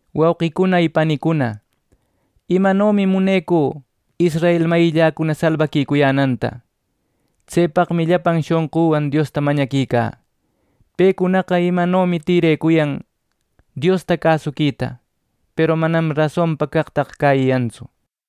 Wauqicuna y panicuna, imanomi munecü israel mayilläcuna salbaquicuyänanta. Tsepaqmi llapan shonquwan Diosta mañaquicä. Pecunaqa imanomi tïrecuyan Diosta cäsuquita; peru manam rasonpa caqtaqa cäyiyantsu.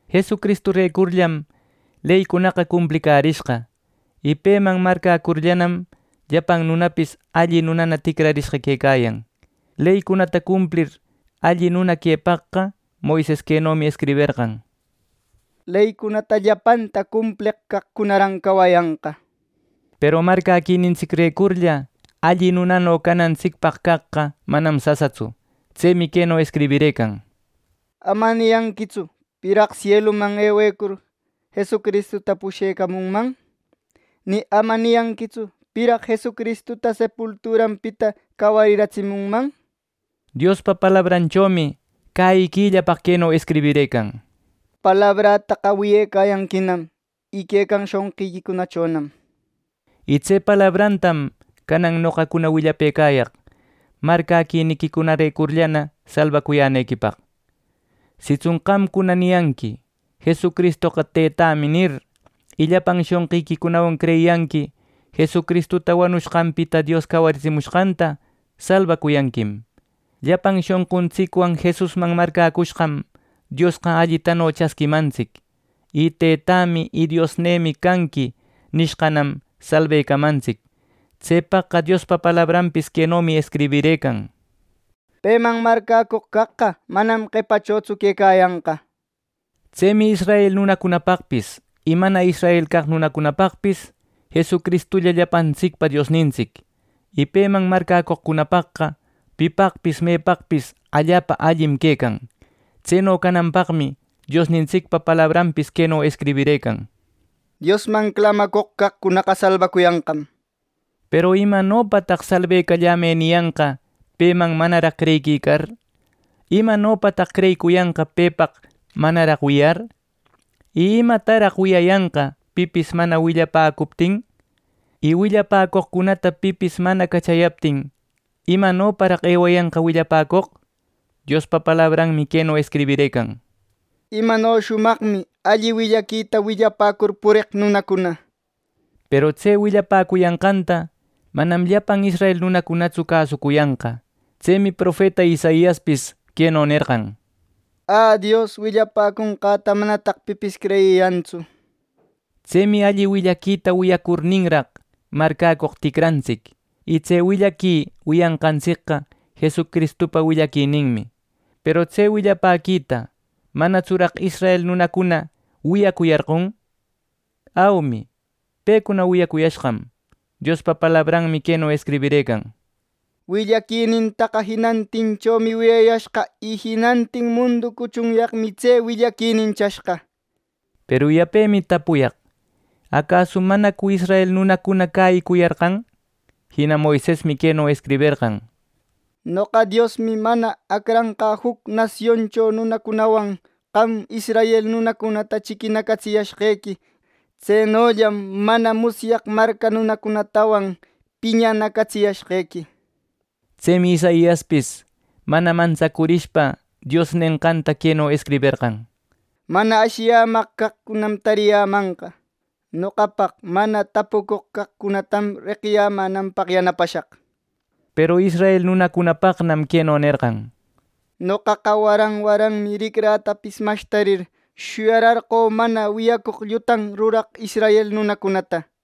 Jesucristurecurllam leycunaqa cumplicärishqa, y peman marcäcurllanam, llapan nunapis alli nunana ticrashqa quecayan. Leycunata cumplir alli nuna quepaqqa, Moises quenomi escriberqan: “Leycunata llapanta cumpleq caqcunaran cawayanqa” nir. Peru marcäquinintsicrecurlla alli nunano canantsicpaq caqqa manam sasatsu. Tsemi queno escribirëcan: “Ama niyanquitsu ‘¿Piraq sieluman ewecur’ Jesucristuta pushecamunman?” nir. “Ni ama niyanquitsu ‘¿piraq Jesucristuta sepulturanpita cawariratsimunman?’” nir. Diospa palabrachomi cäyiquillapaq queno escribirëcan: “Palabrätaqa wiyecayanquinam y quecan shonqiquicunachonam” nir. Y tse palabratam canan noqacuna willapëcayaq marcäquiniquicunarecurlla salbacuyänequipaq. Sitsun qamcuna niyanqui: “Jesucristoqa, Teytämi” nir y llapan shonqiquicunawan creyiyanqui Jesucristuta wanushqanpita Dios cawaritsimushqanta ¡salbacuyanquim! Llapan shonquntsicwan Jesusman marcäcushqam Diosqa allitano chasquimantsic y “Teytämi y Diosnïmi canqui” nishqanam salbecamantsic. Tsepaqqa Diospa palabranpis quenomi escribirëcan: “Peman marcäcoq caqqa manam qepachotsu quecayanqa” nir. Tsemi israel nunapaqpis y mana israel nunapaqpis Jesucristulla llapantsicpa Diosnintsic, y peman mañacoqcunapaqqa pipaqpis mepaqpis allapa allim quecan. Tseno cananpaqmi Diosnintsicpa palabranpis queno escribirëcan: “Diosman clamacoq caqcunaqa salbacuyanqam” nir. Peru ¿imanopataq “Salbecallamë” niyanqa peman manaraq creyiquicar! ¿Imanopataq creyicuyanqa pepaq manaraq wiyar! ¿Y imataraq wiyayanqa pipis mana willapäcuptin! Y willapäcoqcunata pipis mana cachayaptin ¿imanoparaq ewayanqa willapäcoq! Diospa palabranmi queno escribirëcan: “¡Imano shumaqmi salbacuyänanpaq alli willaquita willapäcur pureq nunacuna!” nir. Peru tse willapäcuyanqanta manam llapan israel nunacunatsu cäsucuyanqa. Tsemi profeta Isaiaspis queno nerqan: “¡Ä, Dios! Willapäconqäta manataq pipis creyiyantsu” nir. Tsemi alli willaquita wiyacurninraq marcäcoq ticrarintsic y tse willaqui wiyanqantsicqa Jesucristupa willapäquininmi. Peru tse willapäquita ¿manatsuraq israel nunacuna wiyacuyarqon? ¡Aumi pecuna wiyayashqam! Diospa palabranmi queno escribirëcan: “Willaquinintaqa jinantinchomi wiyayashqa, y jinantin mundu cuchunyaqmi tse willaquinin chashqa” nir. Peru yapemi tapuyaq: ¿Acasu manacu israel nunacuna cäyiyarqan! Jina Moisesmi queno escriberqan: “Noqa, Diosmi, mana acranqä juc nasioncho nunacunawan qam israel nunacunata chiquinacatsiyäshqequi. Tsenollam mana musyaq marca nunacunatawan piñanacatsiyäshequi” nir. Tsemi Isaiaspis mana mantsacurishpa Dios nenqanta queno escriberqan: “Mana ashiyämaq caqcunam tariyämanqa. Noqapaq mana tapucoq caqcunatam reqiyämänanpaq yanapashaq” nir. Peru israel nunacunapaqnam queno nerqan: “Noqaqa waran waranmi ricrätapis mashtarir, shuyararqö mana wiyacoq llutan ruraq israel nunacunata” nir.